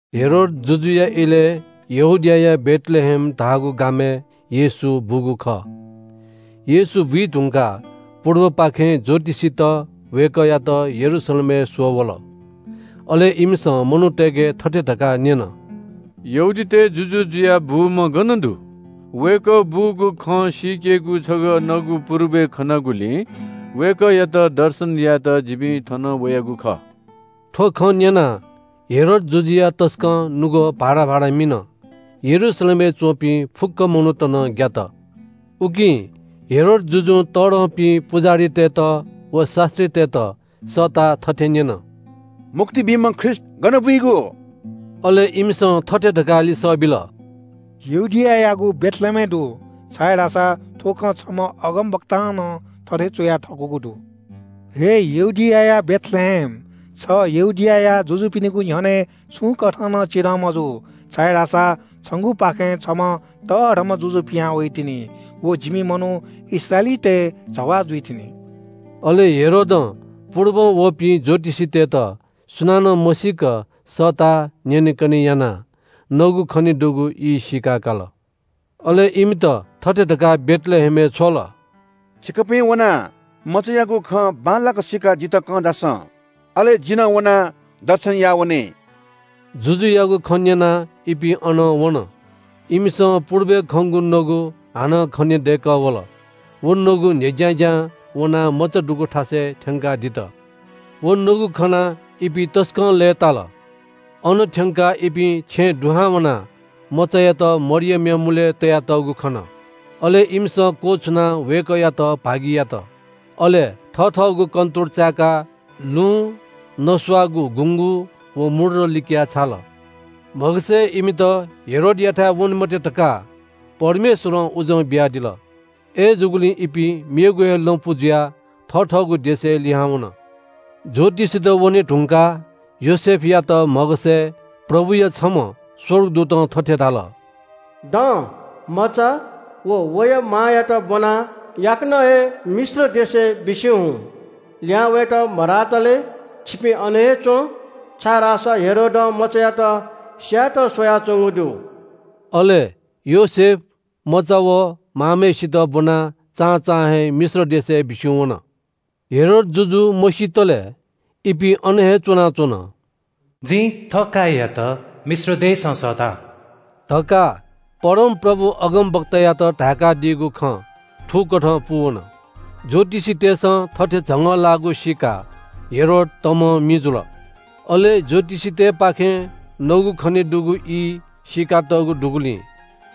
हेरोद जुजुया इलय् यहूदियाया बेथलेहेम धाःगु गामय् येशू बूगु खः। येशू बुइधुंकाः पुर्बपाखें ज्‍योतिषीत वय्‌कःयात यरूशलेमय् स्‍वः वल। अले इमिसं मनूतय्‌के थथे धकाः न्‍यन – “यहूदीतय् जुजु जुयाः बूम्‍ह गन दु? वय्‌कः बूगु खँ सीकेगु छगः नगु पुर्बय् खनागुलिं वय्‌कःयात दर्शन यायेत जिपिं थन वयागु खः।” थ्‍व खँ न्‍यनाः हेरोद जुजुया तसकं नुगः भाराभारा मिन। यरूशलेमय् च्‍वंपिं फुक्‍क मनूत नं ग्‍यात। उकिं हेरोद जुजुं फुक्‍क तःधंपिं पुजाहारीतय्‌त व शास्‍त्रीतय्‌त सःताः थथे न्‍यन – “मुक्ति बीम्‍ह ख्रीष्‍ट गन बुइगु?” अले इमिसं थथे धकाः लिसः बिल – “यहूदियायागु बेथलेहेमय् दु, छाय्‌धाःसा थ्‍व खँ छम्‍ह अगमवक्तां नं थथे च्‍वया थकूगु दु – “‘हे यहूदियाया बेथलेहेम, छ यहूदियाया जुजुपिनिगु न्‍ह्यःने छुं कथं नं चिधं मजू, छाय्‌धाःसा छंगुपाखें छम्‍ह तःधंम्‍ह जुजु पिहां वइतिनि। व जिमि मनू इस्राएलीतय् जवाः जुइतिनि।’” अले हेरोदं पुर्बं वःपिं ज्‍योतिषीतय्‌त सुनानं मसीक सःताः न्‍यनेकने यानाः नगु खनेदुगु ई सीकाकाल। अले इमित थथे धकाः बेथलेहेमय् छ्वल – “छिकपिं वनाः मचायागु खँ बांलाक सीकाः जितः कं झासँ, अले जि नं वनाः दर्शनया वने।” जुजुयागु खँ न्‍यनाः इपिं अनं वन। इमिसं पुर्बय् खंगु नगु हानं खनेदय्‌कः वल। व नगु न्‍ह्यज्‍यां ज्‍यां वनाः मचा दुगु थासय् थ्‍यंकाः दित। व नगु खनाः इपिं तसकं लय्‌ताल। अन थ्‍यंकाः इपिं छेँय् दुहां वनाः मचायात वया मां मरियमनापं खन। अले इमिसं क्‍वछुनाः वय्‌कःयात भागि यात। अले थथःगु कन्‍तुर चाय्‌काः लुँ, नस्‍वाःगु गुँगू व मूर्र लिकयाः छाल। म्‍हगसय् इमित हेरोदयाथाय् वने मते धकाः परमेश्‍वरं उजं बियादिल। अय्‌जूगुलिं इपिं मेगु हे लँपु जुयाः थथःगु देशय् लिहां वन। ज्‍योतिषीत वने धुंकाः योसेफयात म्‍हगसय् प्रभुया छम्‍ह स्‍वर्गदूतं थथे धाल – “दँ, मचा व वया मांयात ब्‍वनाः याकनं हे मिश्र देशय् बिस्‍युं हुँ। लिहां वयेत मधातले छिपिं अन हे च्‍वँ, छाय्‌धाःसा हेरोदं मचायात स्‍यायेत स्‍वयाच्‍वंगु दु।” अले योसेफ मचा व मांम्‍हय्‌सित ब्‍वनाः चां चां हे मिश्र देशय् बिस्‍युं वन। हेरोद जुजु मसीतले इपिं अन हे च्‍वनाच्‍वन। “जिं थःकाय्‌यात मिश्र देशं सःता” धकाः परमप्रभुं अगमवक्तायात धाय्‌कादीगु खँ थुकथं पूवन। ज्‍योतिषीतय्‌सं थथे झंगःलाःगु सीकाः हेरोद तमं मि जुल। अले ज्‍योतिषीतय्‌पाखें नगु खनेदुगु ई सीकातःगु दुगुलिं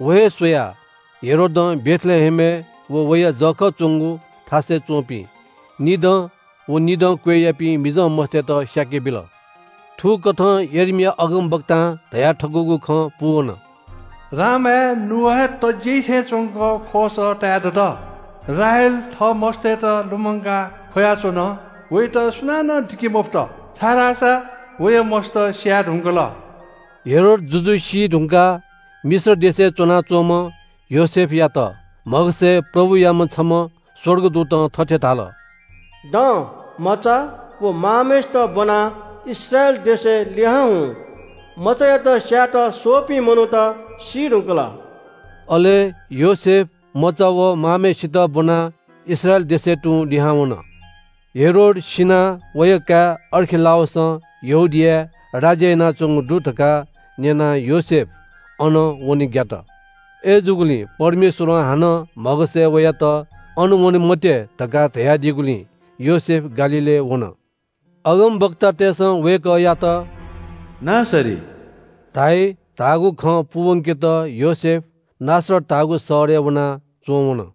व हे स्‍वयाः हेरोदं बेथलेहेमय् व वया जःखः च्‍वंगु थासय् च्‍वंपिं निदँ व निदं क्‍वय्‌यापिं मिजंमस्‍तय्‌त स्‍याकेबिल। थुकथं यर्मिया अगमवक्तां धयाथकूगु खँ पूवन – “रामाय् नुगः हे तज्‍याइ थें च्‍वंक ख्‍वःसः ताये दत। राहेल थः मस्‍तय्‌त लुमंकाः ख्‍वयाच्‍वन। वयात सुनानं दिके मफुत, छाय्‌धाःसा वया मस्‍त स्‍याये धुंकल।” हेरोद जुजु सीधुंकाः मिश्र देशय् च्‍वनाच्‍वंम्‍ह योसेफयात म्‍हगसय् प्रभुयाम्‍ह छम्‍ह स्‍वर्गदूतं थथे धाल – “दँ, मचा व मांम्‍हय्‌सित ब्‍वनाः इस्राएल देशय् लिहां हुँ। मचायात स्‍यायेत स्‍वःपिं मनूत सी धुंकल।” अले योसेफ मचा व मांम्‍हय्‌सित ब्‍वनाः इस्राएल देशय् तुं लिहां वन। हेरोद सिनाः वया काय् अर्खिलाउसं यहूदियाय् राज्‍य यानाच्‍वंगु दु धकाः न्‍यनाः योसेफ अन वने ग्‍यात। अय्‌जूगुलिं परमेश्‍वरं हानं म्‍हगसय् वयात अन वने मते धकाः धयादीगुलिं योसेफ गालील प्रदेशय् वन। अगमवक्तातय्‌सं वय्‌कःयात “नासरी” धाइ धाःगु खँ पूवंकेत योसेफ नासरत धाःगु शहरय् वनाः च्‍वंवन।